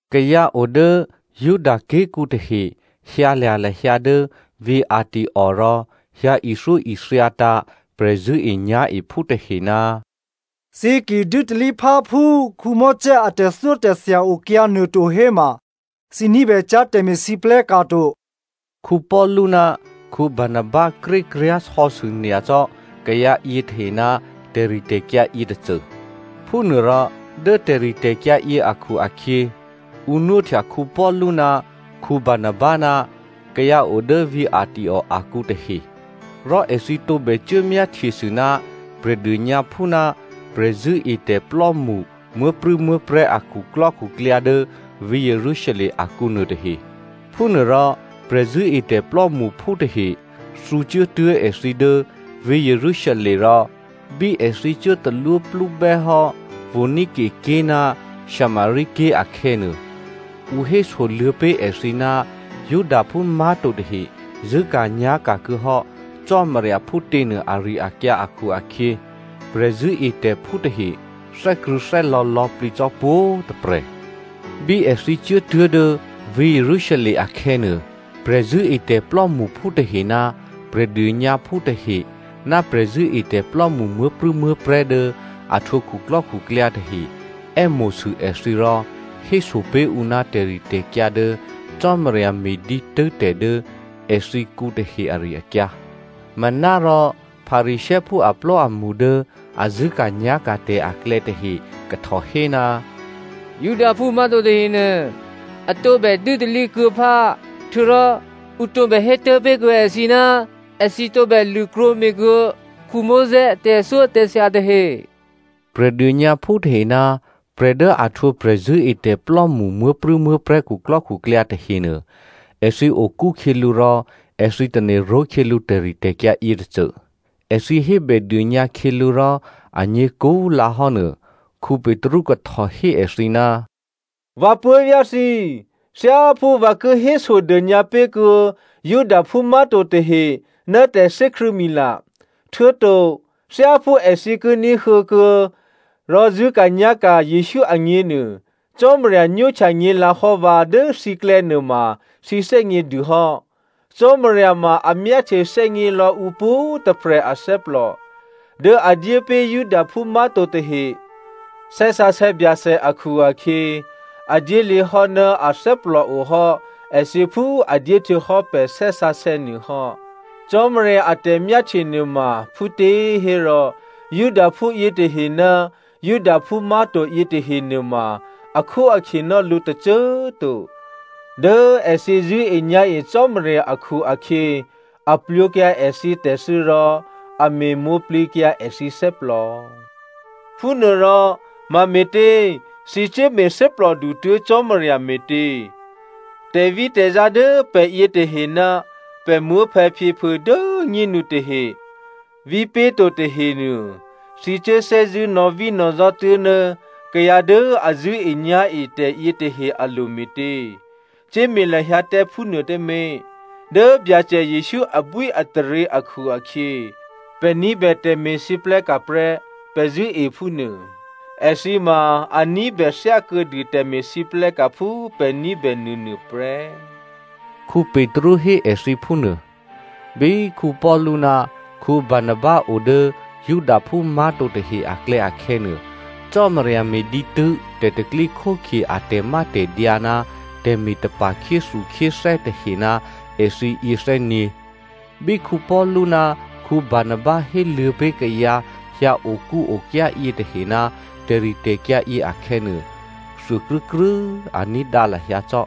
Kayǎ o dố Judaké̤kǔ tahe hyǎlya̤ lahyǎ dố vǐ̤ Antioko rò hyǎ ithyóithyatǎ̤ prè̤zṳ̂́enyá̤ephú tahe, “Thǐ ki dû́talí phá phú꤮ Mosè a tè̤thyótè̤thya okyǎ nuôto héma thǐ ní̤bècyá̤ tè̤me̤lwóhteka̤ to.” Paulu ná Barnaba krékryá̤ sò̌sû nyacò́ kayǎ yětahe ná tè̤ritè̤kyǎ yětôcô. Phúnuôrò dố tè̤ritè̤kyǎ yě akhu-akhyě, ǔ nwóhtya Paulu ná Barnaba ná kayǎ o dố vǐ̤ Antioko akǔ tahe, rò èthǐ tǒbè cuố myáhtyesû ná Prè̤dônyǎphú ná prè̤zṳ̂́etè̤plò́mṳ muố̤prû̌muố̤prè̤́ a khuklò́khuklyǎ dố vǐ̤ Jerusalem akǔ nuôtahe. Phúnuôrò prè̤zṳ̂́etè̤ plò́mṳphú tahe thǔcuốtuố̤ èthǐ dố vǐ̤ Jerusalem rò bí èthǐ cuố talwóplúbè́ hò́ Phonicia ké̤ ná Samaria ké̤ akhè̌nuô, ǔ hésoluô̌ pé̤ èthǐ ná Judaphú má̤to tahe zṳ̂́ka̤nyá̤ka̤ kuô̌hò́ Cò́marya phútěnuô ari-akyǎ akhu-akhyě prè̤zṳ̂́etè̤phú tahe thè́krṳ̂̌thè́lò̌ lò̌plǐ cò́ pwǒ̤꤮ tôprè̤. Bí èthǐ cuốtuố̤ dố vǐ̤ Jerusalem akhè̌nuô, prè̤zṳ̂́etè̤ plò́mṳphú tahe ná Prè̤dônyǎphú tahe ná prè̤zṳ̂́etè̤plò́mṳ muố̤prû̌muố̤prè̤́ dố a htwǒ khuklò́khuklyǎ tahe è́mo̤sû èthǐ rò héso pé̤ ǔ ná tè̤ritè̤kyǎ dố Cò́marya me̤ dǐtû́ tè̤ dố èthǐkǔ tahe ari-akyǎ. Manárò Pharisěophú aplò́amṳ dố a zṳ̂́ka̤nyá̤ka̤ tè̤ aklè̌ tahe kahtò hé, “Judaphú má̤to tahenuô a tǒbè dû́talí kuô̌ phá, htuô̌rò ǔ tǒbè hé tố̤pé̤kuô̌ èthǐ ná èthǐ tǒbè lṳ̂krwǒme̤kuô̌ Mosè a tè̤thyótè̤thya tahe.” Prè̤dônyǎphú tahe ná prè̤ dố a htwǒ prè̤zṳ̂́etè̤plò́mṳ muố̤prû̌muố̤prè̤́ khuklò́khuklyǎ tahenuô, èthǐ okú khyělǔ rò èthǐ tane̤ ró̤khyělǔ tè̤ritè̤kyǎ yětôcô. Èthǐ hébèdônyǎ khyělǔ rò anyě̤ kúlǎhò́ nuô Petru kahtò hé èthǐ, “Vǎ puố̤vyá̤ thǐ꤮, thyáphú vǎ ki hésodônyǎ pé̤kuô̌ Judaphú má̤to tahe ná tè̤thè́krṳ̂̌mila, htuô̌to thyáphú èthǐ ki ní̤huô̌ kuô̌ rò zṳ̂́ka̤nyá̤ka̤ Jesǔ agněnuô, Cò́marya nwóhtya nyě̤lǎhò́ vǎ dố thǐklè̌ nuôma thǐ thè́gně dû hò́. Cò́marya ma a myáhtye thè́gnělò̌ ǔ pwǒ̤꤮ tôprè̤ athè́plò. Dố a dyé pé̤ Judaphú má̤to tahe Thè́ Sǎsè̌ Byacè akhu-akhyě, a dyéluô̌ hò́ ná a thè́plòohò́ èthǐ phú a dyé htuô̌hò́ pè̤ Thè́ Sǎsè̌ nuô hò́. Cò́marya a tè̤myáhtye nuôma phútěhérò, Judaphú yětahe ná Judaphú má̤to yětahe nuôma akhóakhye ná lǔ tôcô꤮ to. Dố èthǐ zṳ̂́enyá̤e Cò́marya akhu-akhyě a plwǒkyǎ èthǐ tè̤thû́ rò a me̤mwǒ̤plǐkyǎ èthǐ thè́plò. Phúnuôrò, mame̤tě thǐ cuốme̤ thè́plòdu tuố̤ Cò́marya me̤tě? Tè̤vítè̤zá dố pè̤ yětahe ná pè̤ muố̤phè̌phyěphuô̌ dố꤮ nyénu tahe vípé̤to tahenuô, thǐ cuố thè́zṳ̂́ nò̌vínò̌zá tuố̤ ná kayǎ dố a zṳ̂́enyá̤e tè̤yětahe alo̤ me̤tě? Cuốme̤ lahyǎ tǎ phúnuô tǎmé̤, dố Byacè Jesǔ abwíataryě akhu-akhyě pè̤ ní̤bè tè̤me̤lwóhteka̤ prè́ pè̤ zṳ̂́e phúnuô. Èthǐ꤮ ma a ní̤bè thyákuô̌dû tè̤me̤lwóhteka̤ phú pè̤ ní̤bè nuônuô prè́,” Petru hé èthǐ phúnuô. Bí Paulu ná Barnaba o dố Judaphú má̤to tahe aklè̌ akhè̌nuô, Cò́marya me̤ dǐtû́ tè̤pro̤tè̤prya̤ a tè̤mátè̤dyǎ ná tè̤me̤tapa̤ khyéthukhyéthè́ tahe ná èthǐyě thè́nyě̤. Bí Paulu ná Barnaba héluô̌ pé̤ kayǎ hyǎokúokyá yětahe ná tè̤ritè̤kyǎ yě akhè̌nuô, thuôkrû́krû́꤮ a ní̤dǎ lahyǎ cò́.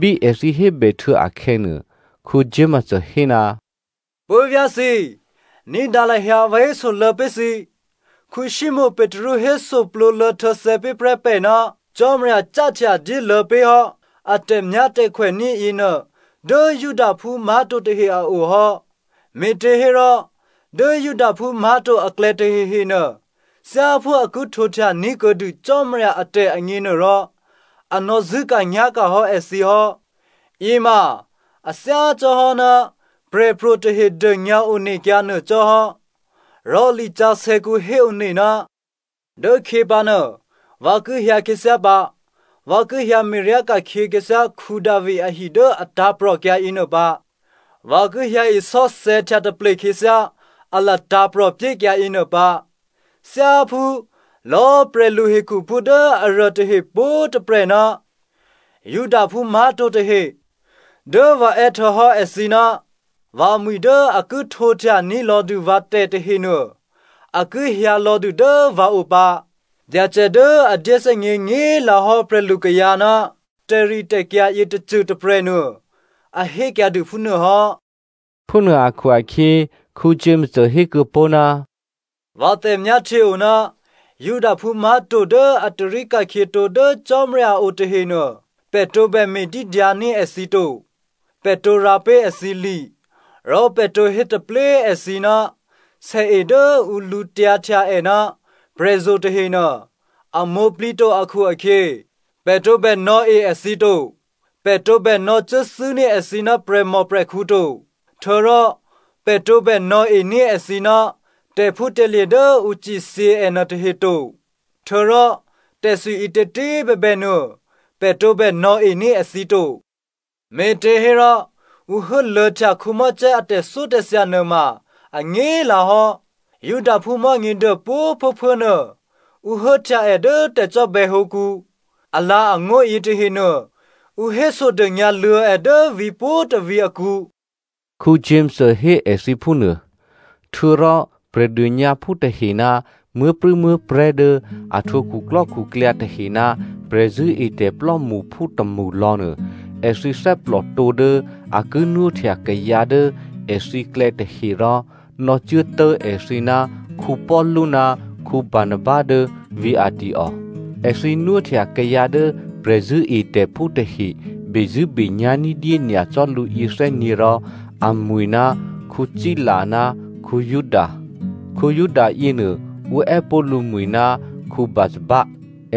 Bí èthǐ hébèhtuô̌ akhè̌nuô, Jakomo hé, “Puố̤vyá̤ thǐ꤮, ní̤dǎ lahyǎ vǎ hésoluô̌ pé̤ thǐ, Simonè Petru hésoplǒluô̌ htuô̌thè̌ pé̤ prè́ pè̤ ná Cò́marya cáhtya dyéluô̌ pé̤ hò́ a tè̤myátè̤khwèní̤ yěnuô dố Judaphú má̤to tahe a o hò́. Me̤těhérò dố Judaphú má̤to aklè̌ tahehenuô, thyáphú a ki htwǒhtya ní̤kuô̌dû Cò́marya atè̤ agněnuôrò, a nò̌ zṳ̂́ka̤nyá̤ka̤ hò́ èthǐ hò́. Yěma a thyácò́hò́ ná prè̤pro̤ tahe dônyǎ onekyǎ nuô cò́hò́, rò lisǎsè̌kǔ héone, ‘Dốkhyě pǎnuô vǎ ki hyǎ khyěthyá pǎ. Vǎ ki hyǎ me̤ryá ka̤khyě khyěthyá Davi ahi dố a tǎ̤prò̤kyǎ yěnuô pǎ. Vǎ ki hyǎ isò́thè̌htya taple khyěthyá a latǎ̤prò̤ pyékyǎ yěnuô pǎ. Thyáphú lò̌꤮ prè̤luhekhuphú dố aruô tahe pwǒ̤꤮ tôprè̤ ná Judaphú má̤to tahe dố vǎ è́ htuô̌hò́ èthǐ ná vǎmwi̤ dố a ki htwǒhtya ní̤lò̌dû vǎ tè̤tahenuô, a ki hyǎlò̌dû dố vǎo pǎ. Byacè dố a dyéthè́gně nyě̤꤮ lǎhò́ prè̤lukayǎ ná tè̤ritè̤kyǎ yětôcô tôprè̤nuô, a hékyǎdû phúnuô hò́.’” Phúnuô akhu-akhyě, Jakomo hékuô̌ pó̤, “Vǎ tè̤myáhtye o ná Judaphú má̤to dố a tarí ka̤khyětǒ dố Cò́marya a o tahenuô pè̤ tǒbè me̤dídyǎní̤ èthǐ to. Pè̤ tǒ rǎ pé̤ èthǐ li, rò pè̤ tǒ hétaplé꤮ èthǐ ná sèe dố ǔ lǔtyǎhtya è ná prè̤zo̤ tahenuô, a mwǒ̤plǐto akhu-akhyě, pè̤ tǒbè nò̌e èthǐ to, pè̤ tǒbè nò̌cuốthû́ní̤ èthǐ ná prè̤mòprè̤khǔ to, htuô̌rò pè̤ tǒbè nò̌ení̤ èthǐ ná tè̤phútè̤lye̤ dố ǔ cithyě è nuôtahe to, htuô̌rò tè̤thwi ǐtětě꤮ bèbènuô, pè̤ tǒbè nò̌ení̤ èthǐ to. Me̤těhérò ǔ hố luô̌htya Mosè a tè̤thyótè̤thya nuôma anyě̤꤮ lǎhò́. Judaphú Mò̤́nyěduô pwǒ̤꤮ phuốphuố꤮ nuô, ǔ hốhtya è dố tè̤cò́bè̌hǒkǔ. Alǎ̤angó̤ yětahenuô ǔ hésodônyǎ luô̌ è dố vǐ̤pwǒ̤tôvǐ̤ akǔ,” Jakomo hé èthǐ phúnuô. Htuô̌rò Prè̤dônyǎphú tahe ná muố̤prû̌muố̤prè̤́ dố a htwǒ khuklò́khuklyǎ tahe ná prè̤zṳ̂́etè̤ plò́mṳphú tômṳlò̌nuô, èthǐ thè́plòtǒ dố a ki nwóhtya kayǎ dố èthǐklè̌ tahe rò nò̌cuốtố̤ èthǐ ná Paulu ná Barnaba dố vǐ̤ Antioko. Èthǐ nwóhtya kayǎ dố prè̤zṳ̂́etè̤phú tahe bezṳ̂́benyá̤ ní̤dyé nyacò́ lǔ yěthè́nyě̤ rò amwi̤ ná Sila ná Juda. Juda yěnuô ǔ è́pó̤ lǔmwi̤ ná Barsabba.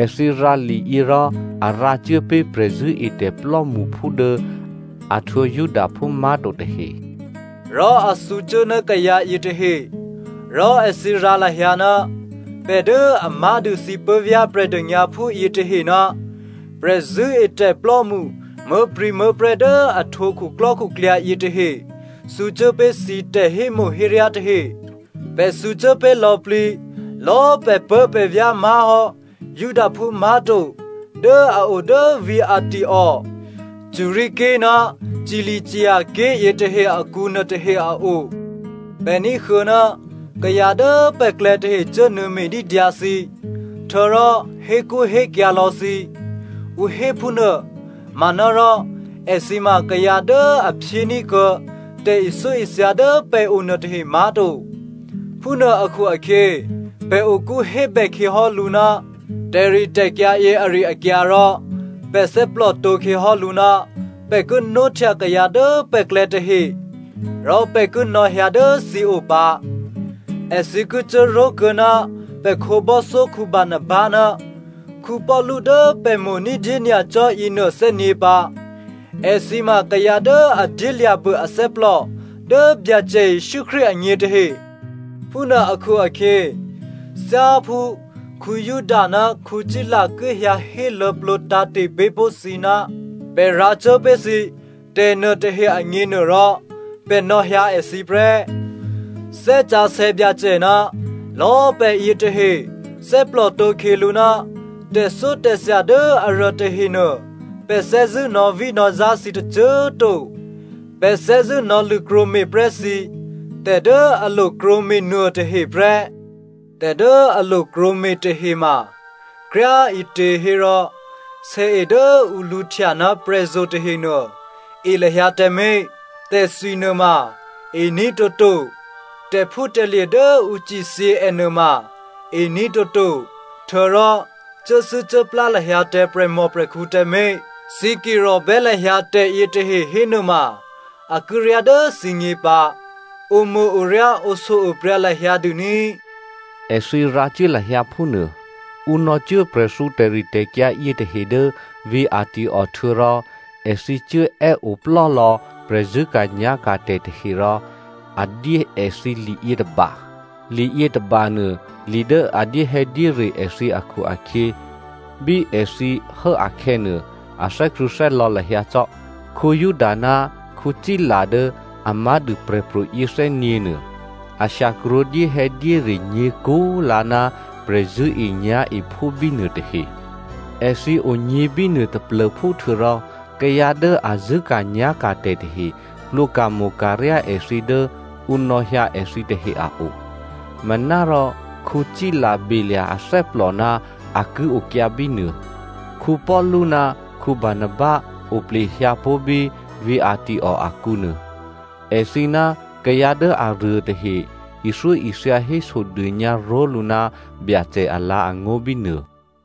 Èthǐ rǎ liyě rò a rǎcuố pé̤ prè̤zṳ̂́etè̤ plò́mṳphú dố a htwǒ Judaphú má̤to tahe, rò a thǔcuố ná kayǎ yětahe. Rò èthǐ rǎ lahyǎ, Pè̤ dố a má̤dû thǐ puố̤vyá̤ Prè̤dônyǎphú yětahe ná prè̤zṳ̂́etè̤plò́mṳ muố̤prû̌muố̤prè̤́ dố a htwǒ khuklò́khuklyǎ yětahe thǔcuố pé̤ thǐ tè̤hémo̤héryá tahe. Pè̤ thǔcuố pé̤ lò̌plǐ lò̌꤮ pè̤puố̤pè̤vyá̤ má̤hò́ Judaphú má̤to dố a o dố vǐ̤ Antioko, Syria ké̤ ná Cilicia ké̤ yětahe akǔ nuôtahe a o. Pè̤ ní̤huô̌ ná kayǎ dố pè̤klè̌ tahe cuốnuô̌ me̤dídyǎ thǐ, htuô̌rò hékṳ́hékyǎ̤ lò̌ thǐ, ǔ hé phúnuô manárò èthǐ ma kayǎ dố a phyéní̤ kuô̌ tè̤ithyóithya dố pè̤o nuôtahe má̤to. Phúnuô akhu-akhyě pè̤ okú hébè khyěhò́lǔ ná tè̤ritè̤kyǎ yě ari-akyǎ rò pè̤ thè́plòtǒ khyěhò́lǔ ná pè̤ ki nwóhtya kayǎ dố pè̤klè̌ tahe rò pè̤ ki nò̌hyǎ dố thǐ o pǎ. Èthǐ ki cuốró̤kuô̌ ná pè̤ khǒbò́thyó Barnaba ná Paulu dố pè̤ mo̤ ní̤dyé nyacò́ yěnuô thè́nyě̤ pǎ. Èthǐ ma kayǎ dố a dyélya̤bû athè́plò dố Byacè Jesǔ Krístu agně tahe. Phúnuô akhu-akhyě thyáphú Juda ná Sila ki hyǎ héluô̌plǒ tǎ̤te̤ pé̤ pó̤ thǐ ná pè̤ rǎcuố pé̤ thǐ tè̤nuôtahe agněnuôrò, pè̤ nò̌hyǎ èthǐ prè́. Thè́ Sǎsè̌ Byacè ná lò̌꤮ pè̤ yětahe thè́plòtǒ khyělǔ ná tè̤thyótè̤thya dố aruô tahenuô pè̤ thè́zṳ̂́ nò̌vínò̌zá thǐ tôcô꤮ to. Pè̤ thè́zṳ̂́ nò̌lṳ̂krwǒme̤ prè́ thǐ tè̤ dố a lo krwǒme̤ nuôtahe prè́. Tè̤ dố a lo krwǒme̤ tahe ma kryá꤮ ǐtěhérò sèe dố ǔ lǔhtya ná prè̤zo̤ tahenuô, e lahyǎ tǎmé̤, tè̤thwi nuôma e ní̤ toto, tè̤phútè̤lye̤ dố ǔ cithyě è nuôma e ní̤ toto, htuô̌rò cuốthû́cuốplá lahyǎ tǎ prè̤mòprè̤khǔ tǎmé̤. Thǐ ki rò̤bè́ lahyǎ tè̤yětahe hénuôma, a ki ryá dố thǐgně pǎ. Omo̤-oryá oshyo-opryǎ lahyǎ dû ní꤮. Èthǐ rǎcuố lahyǎ phúnuô. Ǔ nò̌cuố prè̤thǔ tè̤ritè̤kyǎ yětahe dố vǐ̤ Antioko htuô̌rò èthǐ cuố è́oplò́lò̌ prè̤zṳ̂́ka̤nyá̤ka̤ tè̤tahe rò a dyé èthǐ liyětôba. Liyě tôbanuô, li dố a dyéhè̌dyére èthǐ akhu-akhyě bí èthǐ hố akhè̌nuô, a thè́krṳ̂̌thè́lò̌ lahyǎ cò́. Juda ná Sila dố a má̤dû prè̤pro̤ yěthè́nyě̤nuô, a shyakrwǒ dyéhè̌dyére nyě̤kú꤮ lǎ ná prè̤zṳ̂́enyá̤ephú bínuô tahe. Èthǐ onyě̤ bínuô taplô̤phú htuô̌rò kayǎ dố a zṳ̂́ka̤nyá̤ka̤ tè̤tahe plwǒka̤mo̤ka̤ryá èthǐ dố ǔ nò̌hyǎ èthǐ tahe a o. Manárò Sila belya̤ athè́plò ná a ki okyǎ bínuô. Paulu ná Barnaba oplehyǎ pó̤ bí vǐ̤ Antioko akǔnuô. Èthǐ ná kayǎ dố aruô tahe ithyóithya hésodônyǎ ró̤lǔ ná Byacè alǎ̤angó̤ bínuô.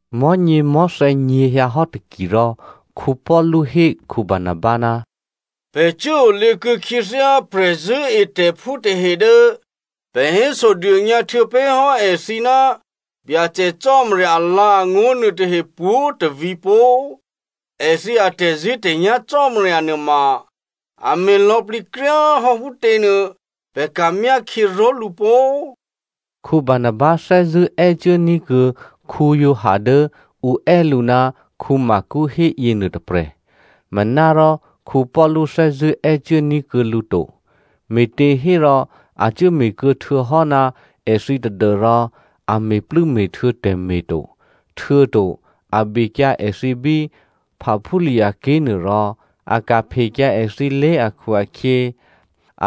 Mò̤́nyěmò̤́thè̌ nyě̤hyǎhò́ taki rò, Paulu hé Barnaba, “Pè̤ cuốolěkuô̌ khyěthyá prè̤zṳ̂́etè̤phú tahe dố pè̤ hésodônyǎ htuô̌pé̤hò́ èthǐ ná Byacè Cò́marya alǎ̤angó̤ nuôtahe pwǒ̤tôvǐ̤ pó꤮, èthǐ atè̤zṳ̂́tè̤nyá̤ Cò́marya nuôma a me̤ lò̌plǐ kryá꤮ hò́ phútě nuô pè̤ ka̤ myákhyě ró̤lǔ pó꤮.” Barnaba thè́zṳ̂́ è́cuốní̤ kuô̌ Giovanni dố ǔ è́ lǔ ná Marko hé yěnuô tôprè̤. Manárò Paulu thè́zṳ̂́ è́cuốní̤ kuô̌ lǔ to, me̤těhérò a cuốme̤ kuô̌ htuô̌hò́ ná èthǐ tadû́rò a me̤plû́me̤htuô̌ tè̤me̤ to, htuô̌to a bekyǎ èthǐ bí Pamphylia ké̤ nuôrò a ka̤phekyǎ èthǐlé̤ akhu-akhyě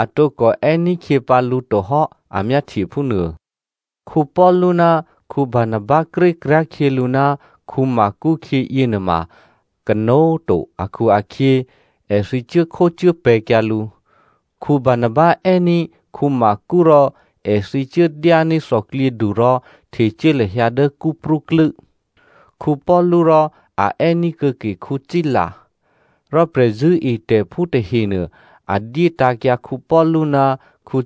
a tǒkò è́ní̤khyě pǎ lǔ tohò́ a myáhtye phúnuô. Paulu ná Barnaba krékryá̤ khyělǔ ná Marko khyě yěnuôma kanó̤꤮ to akhu-akhyě èthǐ cuốkhócuốpè̤̌kyǎ lǔ. Barnaba è́ní̤ Marko rò èthǐ cuốdyání̤ thòklyědu rò htecuố lahyǎ dố Cyprú klû́. Paulu rò a è́ní̤ kuô̌ke Sila. Rò prè̤zṳ̂́etè̤phú tahenuô, a dyé tǎ̤kyǎ Paulu ná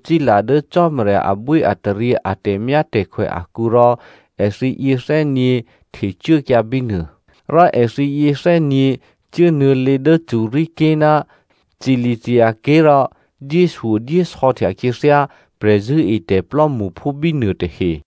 Sila dố Cò́marya abwíataryě a tè̤myátè̤khwè akǔ rò èthǐ yěthè́nyě̤ htecuốkyǎ bínuô. Rò èthǐ yěthè́nyě̤ cuốnuô̌lě dố Syria ké̤ ná Cilicia ké̤ rò dyéshyodyésò̌htya khyěthyá prè̤zṳ̂́etè̤ plò́mṳphú bínuô tahe.